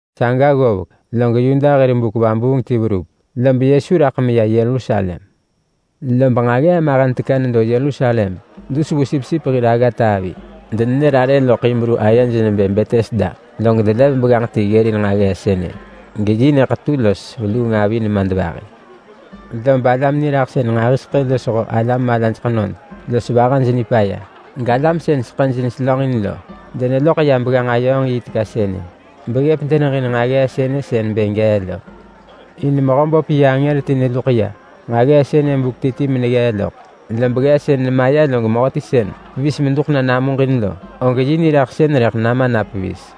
Saga ggovek, log Yuda hir buk vabuung ti verup, lob Yesu raḳ meya Yerusalem. Lob nġaggee mahen teka nedo Yerusalem dus vu sipsip hir aggata avi. Denenër arë loḳ Hibru ayej nebë Betesda. Log delev begganġ ti ggërin nġaggee sënë, geyi nyëḳetu los veluung avi nemadvahi. Lob alam niraḳsën nġahiseḳë losho alam malaj ḳenod los vahaj nipaya, galam sën seḳëj neselönġin lo deneloḳ ya begganġ-ayööng-yi teka sënë beggëp [deneġin nġaggee sënë sën bë gee lo. In Mehöböp yi angër ti neluḳ ya nġaggee sënë buk ti ti meneggee loḳ. Lob ggeesën nemaya log mehöti sën pevis meduḳ na namuġin lo, og yi niraḳsën rëḳ nama na pevis.]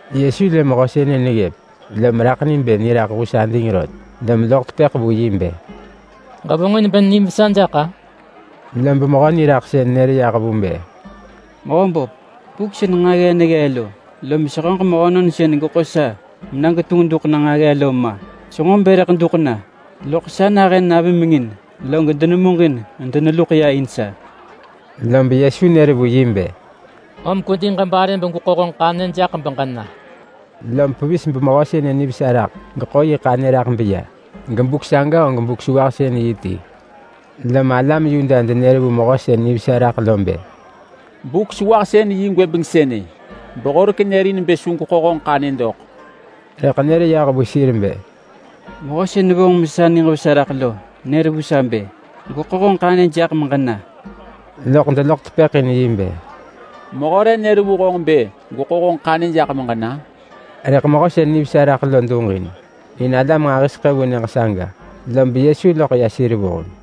Yesu lë mehö sënë neggëp lom raḳ ni bë niraḳ hus ading rot, lom loḳ tepëḳ vu yi bë, “Ġevonġin bë nim vesa jaḳ-a?” Lob mehö niraḳsën nër yah vu bë, “Mehö böp, buk sën nġaggee neggee lo, lom sehöġ mehönon sën geḳo sa mena getunġ duḳ na nġaggee lo ma! Senġo bë rëḳ duḳ na, loḳ sa nahën navimengin log denemuġin medeneluḳ ya in sa.” Lob Yesu nër vu yi bë, “Om kwedi ġebare begweḳo honġ ḳanyë jaḳ beġena!” Lom pevis bemehö sënë nivesa raḳ geḳo yi ḳanyë raḳ beya. Gebuk saga og Buk-sewahsën-yi ti. Lom alam Yuda denër vu mehö sën nivesa raḳ lo bë, “Buk-sewahsën-yi gwëbeng sënë, behorek nërin bë su gweḳo honġ ḳanyë dok!” Rëḳ nër yah vu sir bë, “Mehö sën vonġ sa mesa niġ vesa raḳ lo nër vu sa bë, ‘Gweḳo honġ ḳanyë jaḳ meġena!’” Loḳ deloḳ tepëḳ in yi bë, “Mehö re nër vu honġ bë gweḳo honġ ḳanyë jaḳ meġena?” Rëḳ mehö sën nivesa raḳ lo duġin, in alam nġahiseḳë vu nyëġ saga lob Yesu loḳ ya sir vuheng.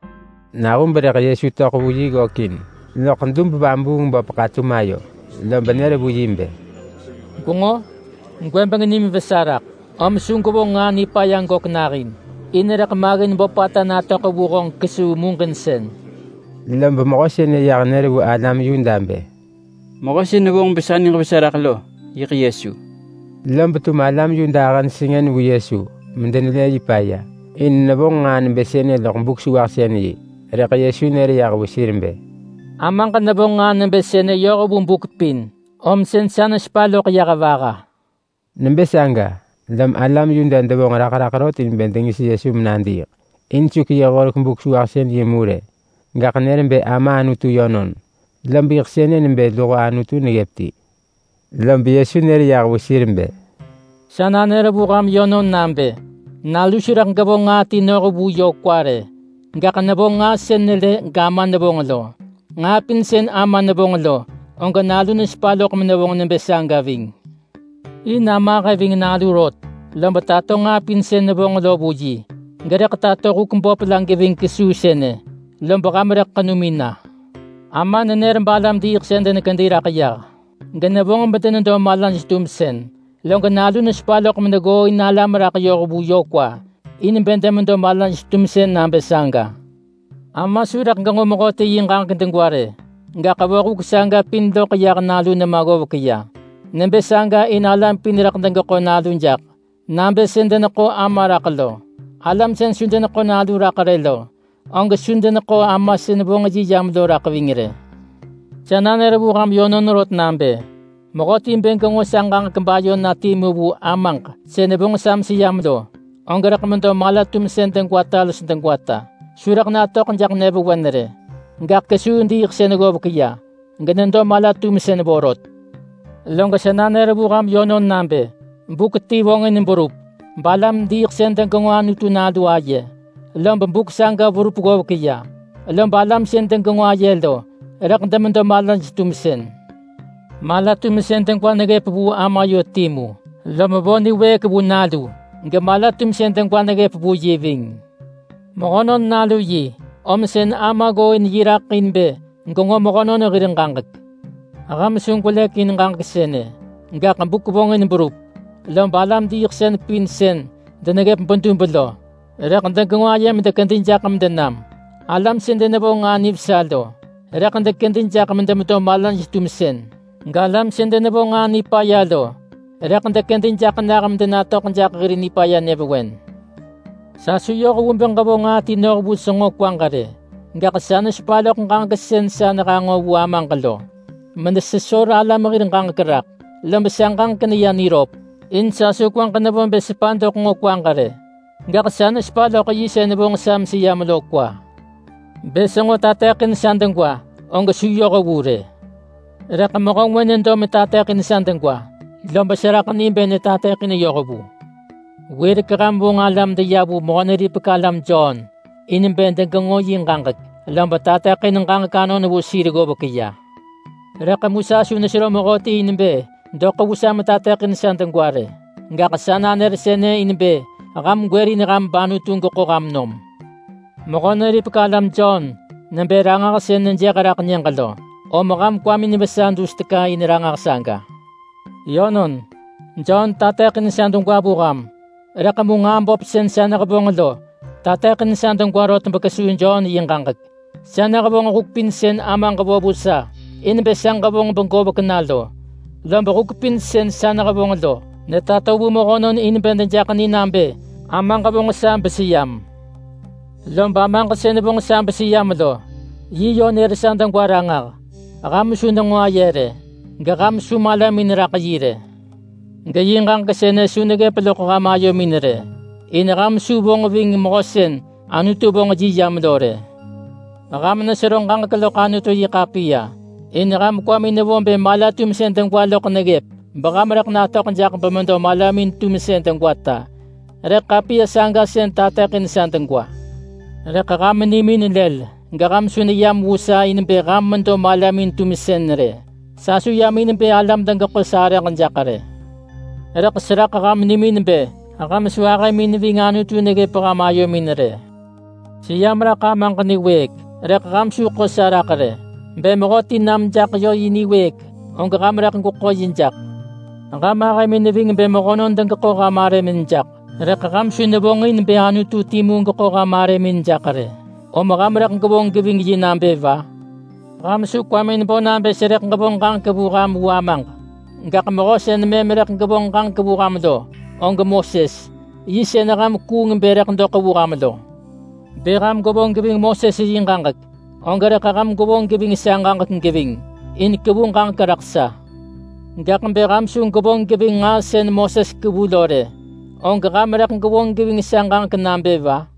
Nahub rëḳ Yesu töḳ vu yi ggökin loḳ dub-vabuung-böp ḳatum ayo lob nër vu yi bë, “Gwenġo? Gwëbeng nim vesa raḳ, om su gwevonġ nġaa nipaya gök nahin, in rëḳ maggin böpata natöḳ vu honġ kesuu muġinsën.” Lob mehö sënë yah nër vu alam Yuda bë, “Mehö sën vonġ besa niġ vesa raḳ lo, yiḳ Yesu.” Lob yiḳ alam Yuda ahëj sengën vu Yesu medenelë yi paya in nevonġ nġaa nebë sënë loḳ Buk-sewahsën-yi. Rëḳ Yesu nër yah vu sir bë, “Amaġ nevonġ nġaa nebë sënë yoh vu buk pin, om sën sa nesepa loḳ yah vaha.” Nebë saga lom alam Yuda devonġ raḳ raḳ rot in bë dengis Yesu menadiiḳ. In su keyëh horek Buk-sewahsën-yi mu rë, gaḳ nër bë Ama Anutu yönon. Lob yiḳ sënë nebë luho Anutu neggëp ti. Lob Yesu nër yah vu sir bë, “Sa nanër vu ham yönon nabë: Nalu su rëḳ gevonġ nġaa ti noh vu yö kwa rë. Gaḳ nevonġ nġaa sën nelë gAma nevonġ lo. Nġaa pin sën Ama nevonġ lo, og Nalu nesepa loḳ menevonġ nebë saga ving. In Ama ahë ving Nalu rot, lob tato nġaa pin sën nevonġ lo vu yi. Gerëḳ tato huk böp la geving kesuu sënë, lob ham rëḳ ḳenumin na. Ama nenër balam-diiḳsën denekedi raḳ yah genevonġ medenedo malaj-tumsën. Log Nalu nesepa loḳ meneggooin alam raḳ yoh vu yö kwa, in bë demedo malaj-tumsën nabë saga. Ama su rëḳ genġo mehöti yi ġaġek degwa rë. Gaḳ vo huk saga pin loḳ yah Nalu nema ggovek ya. Nebë saga in alam pin rëḳ degeḳo Nalu jaḳ, nabë sën deneḳo Ama raḳ lo. Alam sën su deneḳo Nalu raḳ rë lo, og su deneḳo Ama sën vonġ yi yam lo raḳ ving rë. Sa nanër vu ham yönon rot nabë: Mehöti bë genġo sa ġaġek bayo na timu vu Amaġ sën vonġ sa meseyam lo, og rëḳ medo mala-tumsën degwata los degwata. Su rëḳ natöḳ jaḳ nyëvewen rë, gaḳ kesuu diiḳsën ggovek ya genedo mala-tumsën vorot. Log sa nanër vu ham yönon nabë: Buk ti vonġin berup, balam-diiḳsën degenġo Anutu Nalu aye, lob buk saga verup ggovek ya. Lob alam sën degenġo aye lo, rëḳ demedo malaj-tumsën. Mala-tumsën degwa neggëp vu Ama yö timu, lom vo niwëëk vu Nalu gemala-tumsën degwa neggëp vu yi ving. Mehönon Nalu yi, om sën Ama ggooin yi raḳ in bë genġo mehönon hir ġaġek. Ham su gwelëk in ġaġek sënë. Gaḳ buk vonġin berup, lob alam-diiḳsën pin sën deneggëp bedub lo, rëḳ degenġo aye medekedi jaḳ medenam. Alam sën denevonġ nġaa nivesa lo, rëḳ dekedi jaḳ medemedo malaj-tumsën. Galam sën denevonġ nġaa nipaya lo, rëḳ dekedi jaḳ nah medenatöḳ jaḳ hir nipaya nyëvewen. Sa su yoh vu bë ġevonġ nġaa ti noh vu senġo kwaġ rë. Gaḳ sa nesepa loḳ ġaġek sën sa nehanġo vu Amaġ lo menesesor alam hir ġaġek raḳ. Lob sa ġaġek neya niröp in sa su kwaġ nevo bë sepa doḳ nġo kwaġ rë, gaḳ sa nesepa loḳ yi sën vonġ sa meseyam lo kwa. Bë senġo tateḳin sa degwa og su yoh vu rë. Rëḳ mehö ngwë nedo metateḳin sa degwa, lob seraḳ ni bë netateḳin yoh vu. Wirek ham vonġ alam deya vu Mehö-neripek-alam Jon in bë degenġo yi ġaġek, lob tateḳin ġaġek anon vu sir ggovek ya. Rëḳ mu sa su nesero mehöti in bë doḳ vu sa metateḳin sa degwa rë. Gaḳ sa nanër sënë in bë ham gwërin ham bAnutu geḳo ham nom. Mehö-neripek-alam Jon nebë ranġah sën nejëh raḳ nyëġ lo, om ham kwamin vesa dus teka in ranġah saga. Yönon, Jon tateḳin sa degwa vu ham, rëḳ mu nġaa böp sën sa nehevonġ lo tateḳin sa degwa rot bekesuu Jon yi ġaġek. Sa nehevonġ huk pin sën Amaġ vo vu sa in bë sa ġevonġ begovek na lo. Lob huk pin sën sa nehevonġ lo netato vu mehönon in bë dejaḳ ni nabë Amaġ vonġ sa beseyam. Lob Amaġ sën vonġ sa beseyam lo, yi yö nër sa degwa ranġah. Ham su nenġo aye rë, geham su malamin neraḳ yi rë. Geyi ġaġek sënë su neggëp loḳ ham ayomin rë. In ham su vonġ ving mehö sën Anutu vonġ yi yam lo rë. Ham nesero ġaġek loḳ Anutu-yi-ḳapiya, in ham kwamin nevo bë mala-tumsën degwa loḳ neggëp beham rëḳ natöḳ jaḳ bemedo malamin-tumsën degwata. Rëḳ ḳapiya saga sën tateḳin sa degwa. Rëḳ ham nimin lël geham su neyam vu sa in bë ham medo malamin-tumsën rë. Sa su yam in bë alam degeḳo sarëġ jaḳ rë! Rëḳ seraḳ ham nimin bë ham su ahëmin ving Anutu neggëp ham ayomin rë. Seyam raḳ Amaġ niwëëk, rëḳ ham su ḳo sa raḳ rë. Bë mehöti nam jaḳ yö yi niwëëk, og ham rëḳ gweḳo yi jaḳ. Ham ahëmin neving bë mehönon degeḳo ham arëmin jaḳ, rëḳ ham su nevonġin bë Anutu timu geḳo ham arëmin jaḳ rë, om ham rëḳ gwevonġ geving yi nabë va? Ham su kwamin bo nabë serëḳ ġevonġ ġaġek vu ham vu Amaġ. Gaḳ mehö sën mëm rëḳ gevonġ ġaġek vu ham lo, og Moses. Yi sën ham kuung bë rëḳ doḳ vu ham lo! Bë ham gwevonġ geving Moses yi ġaġek, og rëḳ ham gwevonġ geving sa ġaġek geving. In kevu ġaġek raḳ sa. Gaḳ bë ham su gwevonġ geving nġaa sën Moses kevu lo rë, og ham rëḳ gwevonġ geving sa ġaġek nabë va?”